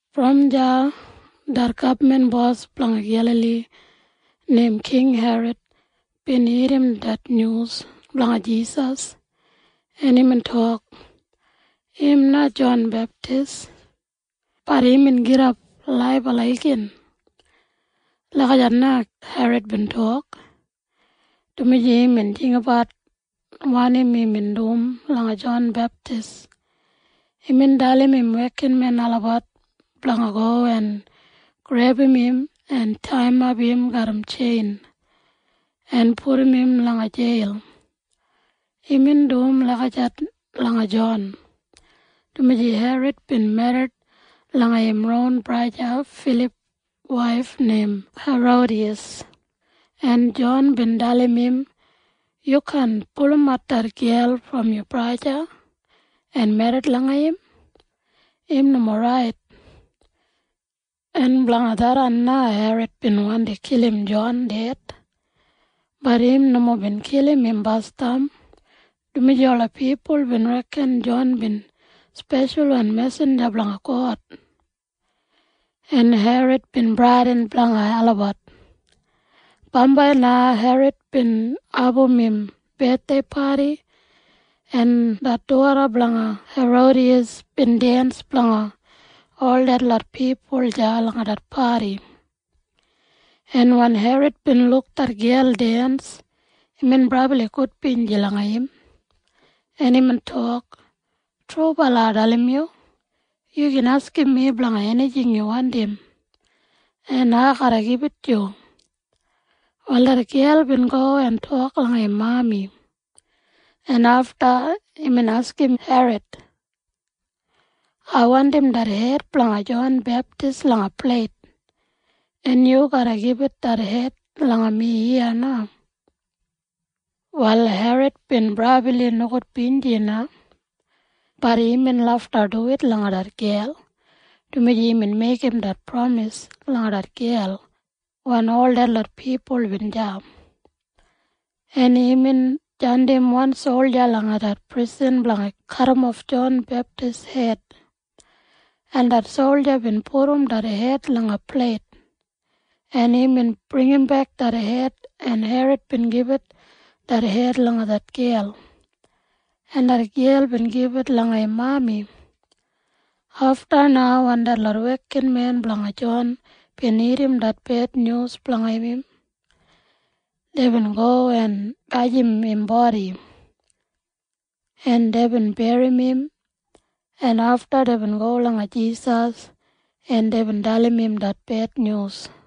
Brom deya det gabman bos blanga Gelali neim King Herod bin irrim det nyus blanga Jisas, en imbin tok, “Im na Jon Beptis, bat imbin gidap laibala igin.” Lagijat na Herod bin tok, dumaji imbin jinggabat wanim imbin dum langa Jon Beptis basdam. Imbin dalim im wekinmen olabat blanga go en grebum im en taiyimap im garram tjein en pudum im langa jeil. Imbin dum lagijat langa Jon, dumaji Herod bin merrit langa im ron braja Filip waif neim Herodiyas, en Jon bin dalim im, “Yu kaan pulumat det gel brom yu braja en merrit langa im. Im nomo rait.” En blanga tharran na Herod bin wandi kilim Jon ded. Bat im nomo bin kilim im basdam, dumaji ola pipul bin reken Jon bin speshalwan mesinja blanga God, en Herod bin bradin blanga olabat. Bambai na Herod bin abum im bethdei padi, en det doda blanga Herodiyas bin dens blanga ol detlot pipul deya langa det padi, en wen Herod bin luk det gel dens, imbin brabli gudbinji langa im, en imbin tok, “Trubala ai dalim yu. Yu gin askim mi blanga enijing yu wandim, en ai garra gibit yu.” Wal det gel bin go en tok langa im mami, en afta imbin askim Herod, “Ai wandim det hed blanga Jon Beptis langa pleit, en yu garra gibit det hed langa mi iya na.” Wal Herod bin brabli nogudbinji na. Bat imbin lafta duwit langa det gel, dumaji imbin meigim det pramis langa det gel wen ol detlot pipul bin deya. En imbin jandim wan solja langa det prisan blanga kadimof Jon Beptis hed, en det solja bin pudum det hed langa pleit, en imbin bringimbek det hed, en Herod bin gibit det hed langa det gel, en det gel bin gibit langa im mami. Afta na wen detlot wekinmen blanga Jon bin irrim det bednyus blanga im, deibin go en gajim im bodi, en deibin berrim im, en afta deibin go langa Jisas, en deibin dalim im det bednyus.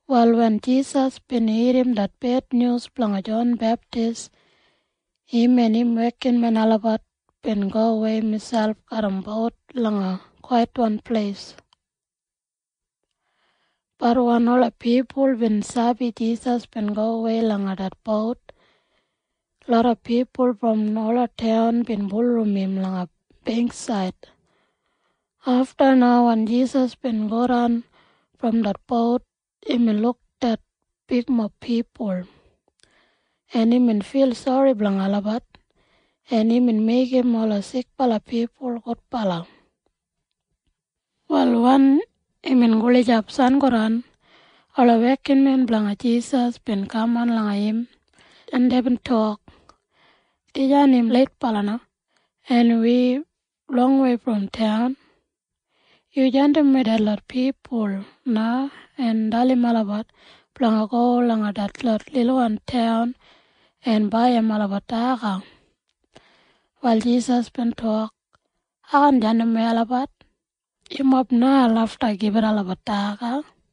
Wal wen Jisas bin irrim det bednyus blanga Jon Beptis, im en im wekinmen olabat bin gowei miselp garram bout langa kwaitwan pleis. Bat wen ola pipul bin sabi Jisas bin gowei langa det bout, loda pipul brom ola taun bin bulurrum im langa beingksaid. Afta na wen Jisas bin godan brom det bout, imbin luk det bigmob pipul, en imbin fil sori blanga olabat, en imbin meigim ola sikbala pipul gudbala. Wal wen imbin gulijap sangodan, ola wekinmen blanga Jisas bin kaman langa im, en deibin tok, “Dijan im leitbala na, en wi longwei brom taun. Yu jandimwei detlot pipul na en dalim olabat blanga go langa detlot lilwan taun en baiyim olabat daga.” Wal Jisas bin tok, “Ai kaan jandimwei olabat. Yumob na lafta gibit olabat daga.”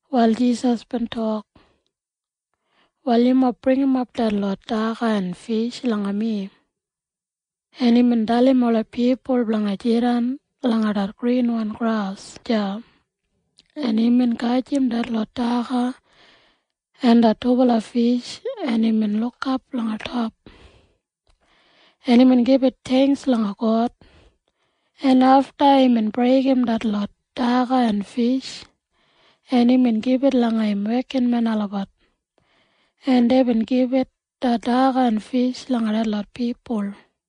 Wal Jisas bin tok, “Wal yumob bringimap detlot daga en fish langa mi.” En imbin dalim ola pipul blanga jidan langa det grinwan gras deya, en imbin gajim detlot daga en det dubala fish, en imbin lukap langa top, en imbin gibit theingks langa God, en afta imbin breigim detlot daga en fish, en imbin gibit langa im wekinmen olabat, en deibin gibitat det daga en fish langa detlot pipul.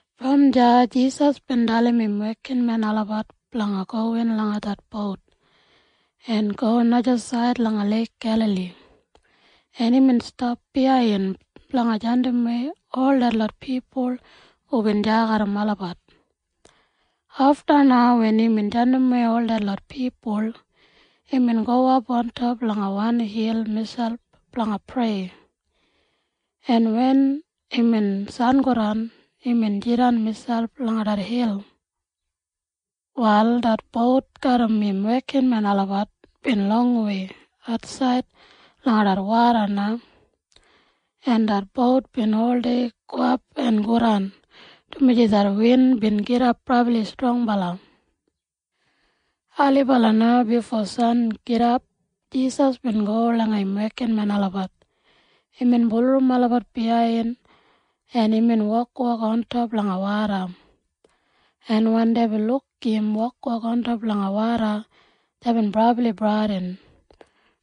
Brom deya Jisas bin dalim im wekinmen olabat blanga gowin langa det bout en go najasaid langa Leik Gelali, en imbin stap biyain blanga jandimwei ol detlot pipul hubin deya garram olabat. Afta na wen imbin jandimwei ol detlot pipul, imbin gowap ontop langa wan hil miselp blanga prei, en wen imbin sangodan, imbin jidan miselp langa det hil. Wal det bout garram im wekinmen olabat bin longwei atsaid langa det woda na, en det bout bin oldei gowap en godan, dumaji det win bin gidap brabli strongbala. Ailibala na bifo sangidap Jisas bin go langa im wekinmen olabat. Imbin bulurrum olabat biyain, en imbin wokwok ontop langa woda, en wen deibin luk im wokwok ontop langa woda, deibin brabli bradin,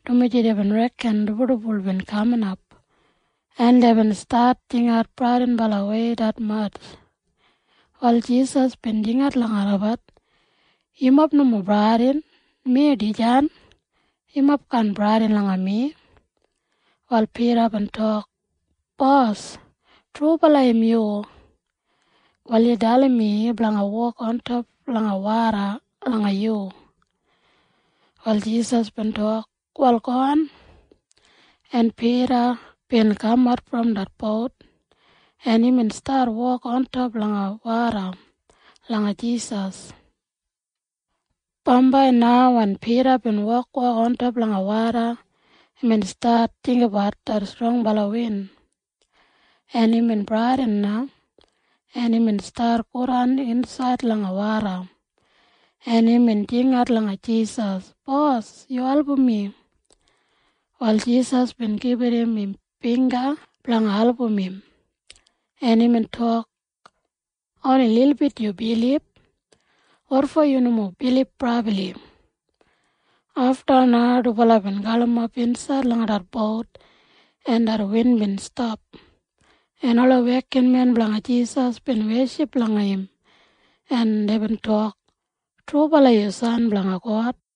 dumaji deibin reken dibuldibul bin kaminap, en deibin stat jingat bradinbalawei detmatj. Wal Jisas bin jingat langa olabat, “Yumob nomo bradin. Mi dijan. Yumob kaan bradin langa mi.” Wal Pida bin tok, “Bos, trubala im yu? Wal yu dalim mi blanga wok ontop langa woda langa yu.” Wal Jisas bin tok, “Wal gowan.” En Pida bin kamat brom det bout, en imbin stat wok ontop langa woda langa Jisas. Bambai na wen Pida bin wokwok ontop langa woda, imbin stat jinggabat det strongbala win, en imbin bradin na, en imbin stat godan insaid langa woda, en imbin jingat langa Jisas, “Bos! Yu album mi!” Wal Jisas bin gibit im bingga blanga album im, en imbin tok, “Oni lilbit yu bilib. Wotfo yu nomo bilib brabli?” Afta na dubala bin galimap insaid langa det bout, en det win bin stap, en ola wekinmen blanga Jisas bin weship langa im en deibin tok, “Trubala yu San blanga God!”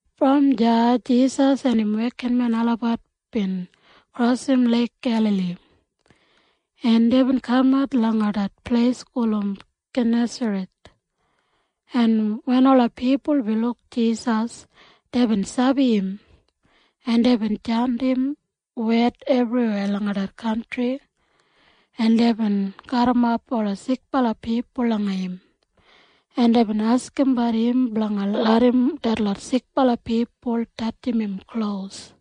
Brom deya Jisas en im wekinmen olabat bin krosim Leik Gelali, en deibin kamat langa det pleis gulum Genesaret. En wen ola pipul bin luk Jisas, deibin sabi im, en deibin jandim wed ebriweya langa det kantri, en deibin garrimap ola sikbala pipul langa im, en deibin askimbat im blanga larram detlot sikbala pipul tatjim im klos,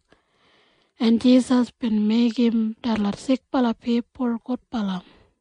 en Jisas bin meigim detlot sikbala pipul gudbala.